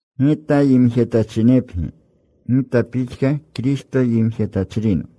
Gita yimjetachinepgi, gita pixka Kristo yimjetachrino.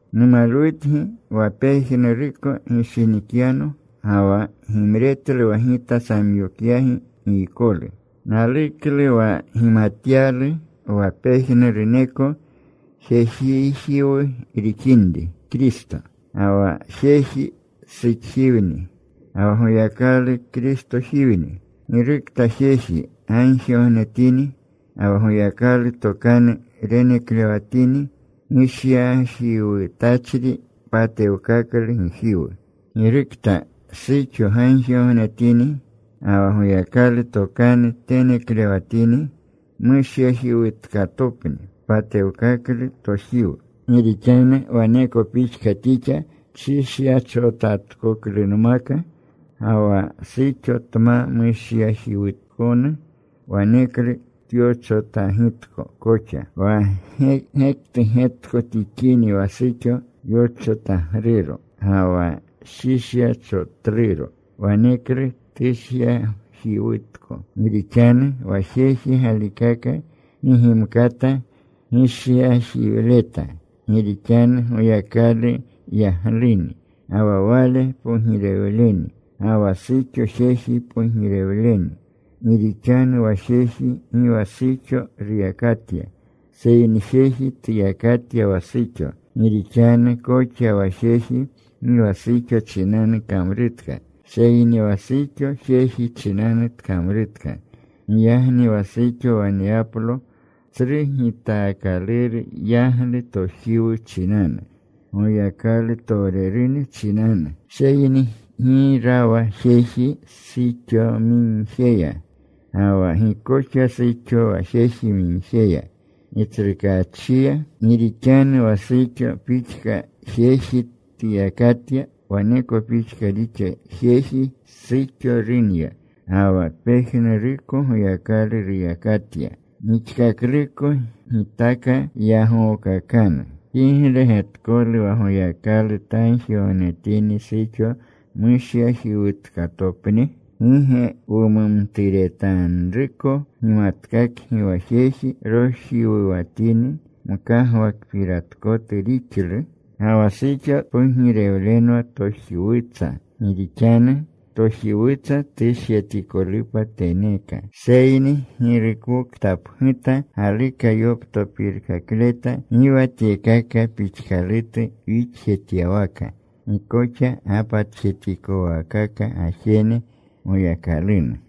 Numalwutgi wa pejnuruko gishinikyano, ga wa gimretlu wa gita samyokyagi giykolu. Naluklu wa gimatyalu wa pejnuruneko jejijiwu rixinri Kristo. Ga wa jeji suxjiwni. Ga wa Goyakalu Kristojiwni. Girukta jeji gagjigognetini ga wa Goyakalu tokanu reneklewatini gishyajiwutachri patewkaklu gijiwu. Girokta suxo gagjigognetini ga wa Goyakalu tokanu teneklewatini mushyajiwutkatopni, tpatewkaklu tojiwu. Gi rixanu waneko pixka tixa tshishyachotatkoklunmaka. Ga wa suxo tma mushyajiwutkonu, waneklu tyochotagitko koxa. Wa gektu getko tixini wa suxo yochotagruro ga wa shishyachotluro waneklu tushyajiwutko. Gi rixanu wa jeji galikaka gi gimkata gishyajiwleta gi rixanu Goyakalu yagluni ga wa Wale pogirewleni. Ga wa suxo jeji pogirewleni. Gi rixanu wa jeji gi wa suxo ruyakatya, seyni jeji tuyakatya wa suxo. Gi rixanu koxa wa jeji gi wa suxo chinanu kamrutka. Seyni wa suxo jeji chinanu tkamrutka. Giyagni wa suxo waneyaplo tsru gitaakaluru yaglu tojiwu chinanu Goyakalutowrerune chinanu. Seyni gi rawa jeji suxomigjeya, ga wa gi koxa suxo wa jejimigjeya Gitsrukaachiya. Gi rixanu wa suxo pixka jeji tuyakatya, waneko pixka rixa jeji. Suxo runya. Ga wa pejnuruko Goyakalu ruyakatya. Gixkakluko gitaka yagookakanru. ¿Kigle getkolu wa Goyakalu tagjigognetini suxo mushyajiwutkatopni? ¿Gi ge wumumturetanruko gimatkakgi wa jeji rojiwuwatini, mkagwakpiratkotu rixlu? Ga wa suxo tpogirewlenwa tojiwutsa. Gi rixanu tojiwutsa tushyatikolupa teneeka. Seyni girukoktapguta galuka yoptopirkakleta, gi wa tyekaka pixkalutu wixjetyawaka. Gi koxa gapatjetikowaakaka gajene Goyakalunu.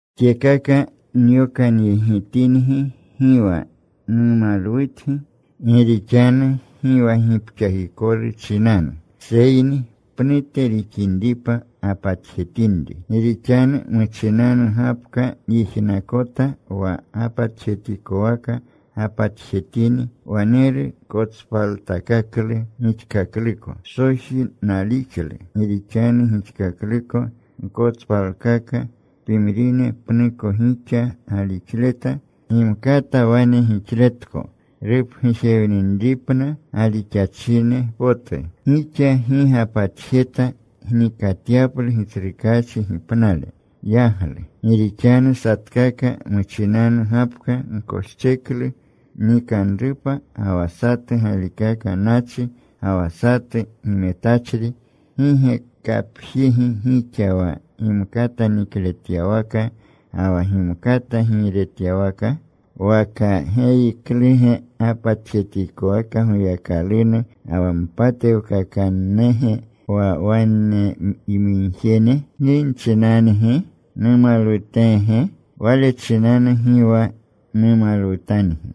Tyekaka nyokanyegitingi, gi wa numalwutgi gi rixanu gi wa gipxakikolu chinanu, seyni pnute rixinripa gapatjetinri. Gi rixanu muchinanu gapka nyijnakota wa gapatjetikwaka gapatjetini, waneru kotspaltakaklu gixkakluko. Psoji nalixlu. Gi rixanu gixkakluko gkotspalkaka. Pimrine pnuko gixa galixleta. Gimkata wane gixletko rupgujewninripna galixachine potu. Gixa gi gapatjeta gnikyaplu Gitsrukaachi gipnale yaglu. Gi rixanu satkaka muchinanu gapka koscheklu nikanrupa. Ga wa satu galikaka nachi, ga wa satu gimetachri. ¿Gi ge kapjigi gixa wa gimkata nikletyawaka ga wa gimkata giiretyawaka? ¿Waka geyikluge gapatjetikowaka Goyakalunu ga wa mpatewkakannage wa waneyamigjene? ¿Gi nchinangi? ¿Numalwuteege? Wale chinanu gi wa numalwutangi.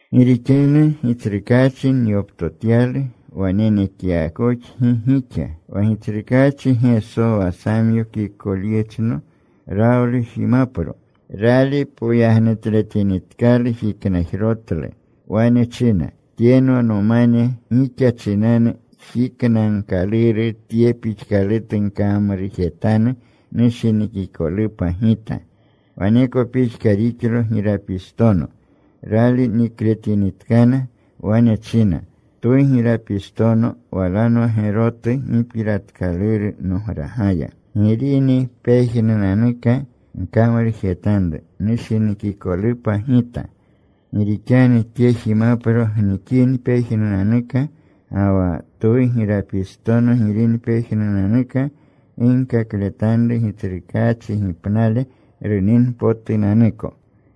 Gi rixanu Gitsrukaachi nyoptotyalu wa nenekyakoxgi gixa, wa Gitsrukaachi Geso, wa samyokikolyechno, rawlu jimapro. Rali poyagnutletinitkalu, jiknajrotlu. Wane china, “Tyenwa nomane, gixa chinanu jiknagkaluru. Tye pixkalutu gkamrujetanu nushinikikolupa Gita.” Waneko pixka rixlo girapistono, rali nikletinitkana. Wane china, “Twu girapistono walanwa gerotu gipiratkaluru nogragaya. Girini pejnunanuka, gkamrujetanru nushinikikolupa Gita.” Gi rixanu tye jimapro gnikini pejnunanuka, ga wa twu girapistono girini pejnunanuka, ginkakletanru Gitsrukaachi gipnale runinpotunanuko.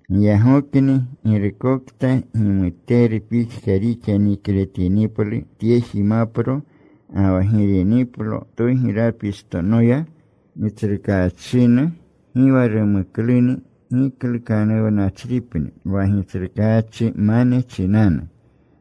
Giyagokni girukokta gimuteru pixka rixa nikletiniplu tye jimapro, ga wa giriniplo twu girapistonoya Gitsrukaachinu, gi wa rumukluni, giklukanuwnachripni wa Gitsrukaachimane chinanu,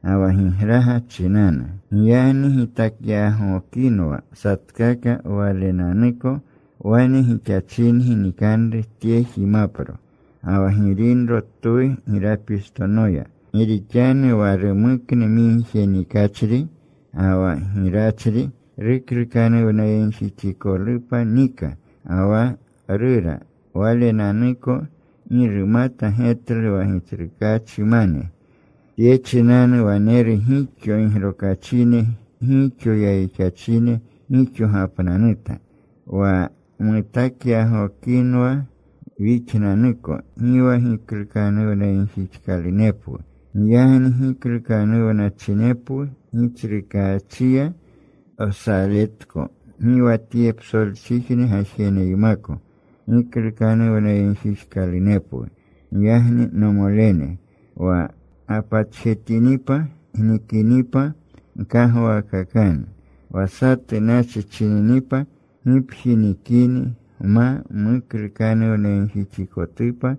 ga wa gigraga chinanu. Giyagni gitakyagokinwa satkaka walenanuko. Wane gixachingi nikanru tye jimapro, ga wa giranro twu girapistonoya. Gi rixanu wa rumuknu migje nikachri ga wa girachri ruklukanuwnayegjixikolupa nika ga wa rura walenanuko. Gi rumata getlu wa Gitsrukaachimane. Tye chinanu wanena gixo gigrokachine, gixo yayixachine. Gixo gapnanuta. Wa wutakyagokinwa wixnanuko, gi wa giklukanuwnayegjixkalunepwu. Giyagni giklukanuwnachinepwu, Gitsrukaachiya wsaletko gi wa tye psolchijne gajeneymako giklukanuwnayegjixkalunepwu. Giyagni, nomolene, wa gapatjetinipa gnikinipa, gkagwaakakanu. Wa satu nachi chininipa, gipji nikini gma muklukanuwnayegjixikotupa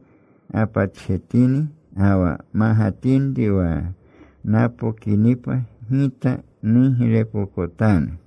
gapatjetini. Ga wa magatinri wa napokinipa gita nuglepokotanu.